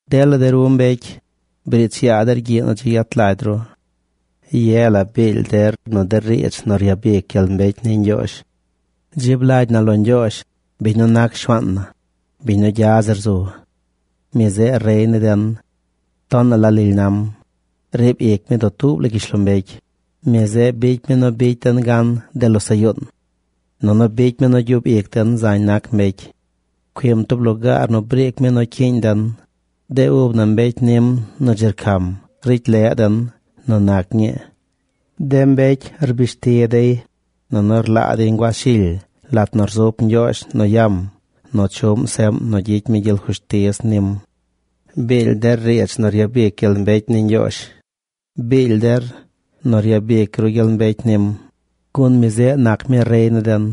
Dela de ru mbecy, briich yaa der gyiꞌ nu dzi yet lagy ru. Ye la biily der nu de riidz nu ryabic gyel mbecy ni Ñgyoozh. Dzib lagy na lo Ñgyoozh, biñ nu nac Shuaan na, biñ nu gya zir zu. Mi zeꞌ Rey ni den. Tonaꞌ la lily nam. Riib ic mi dutuub la gyishlombecy. Mi zeꞌ bicy mi nu bicy den gan de losaꞌ yuun. Nunu bicy mi nu gyub ic den zañ nac mbecy. Pcuim tub lugaar nu briic mi nu cyiiñ den. De ub na, mbecy nim nu dzi rcam, ricy leꞌ den nu nac ñii. De mbecy rbishti dey, nunu rlaa dey nguaz shily lat nu rzup Ñgyoozh nu yam nu chuꞌm seꞌm nu gyicy mi gyel fushtiz nim. Biily der riidz nu ryabic gyel mbecy ni Ñgyoozh. Biily der nu ryabic ru gyel mbecy nim, gun mi zeꞌ nac mi rey ni den.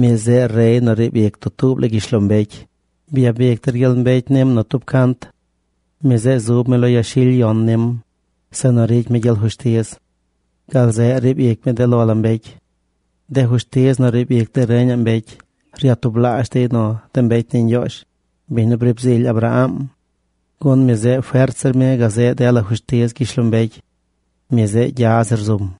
Mi zeꞌ rey nu riib ic dutuub la gyishlombecy. Byabic der gyel mbecy nim nu tub cant. Mi zeꞌ zub mi lo yashily yon nim, zeꞌ nu ricy mi gyel fushtiz. Gal zeꞌ riib ic mi de lo la mbecy. De fushtiz nu riib ic de reñaꞌ mbecy ryatublaazh dey nu de mbecy ni Ñgyoozh, biñ nu briib zily Abraang. Gun mi zeꞌ fert zir mi gazeꞌ dela fushtiz gyishlombecy. Mi zeꞌ gya zir zum.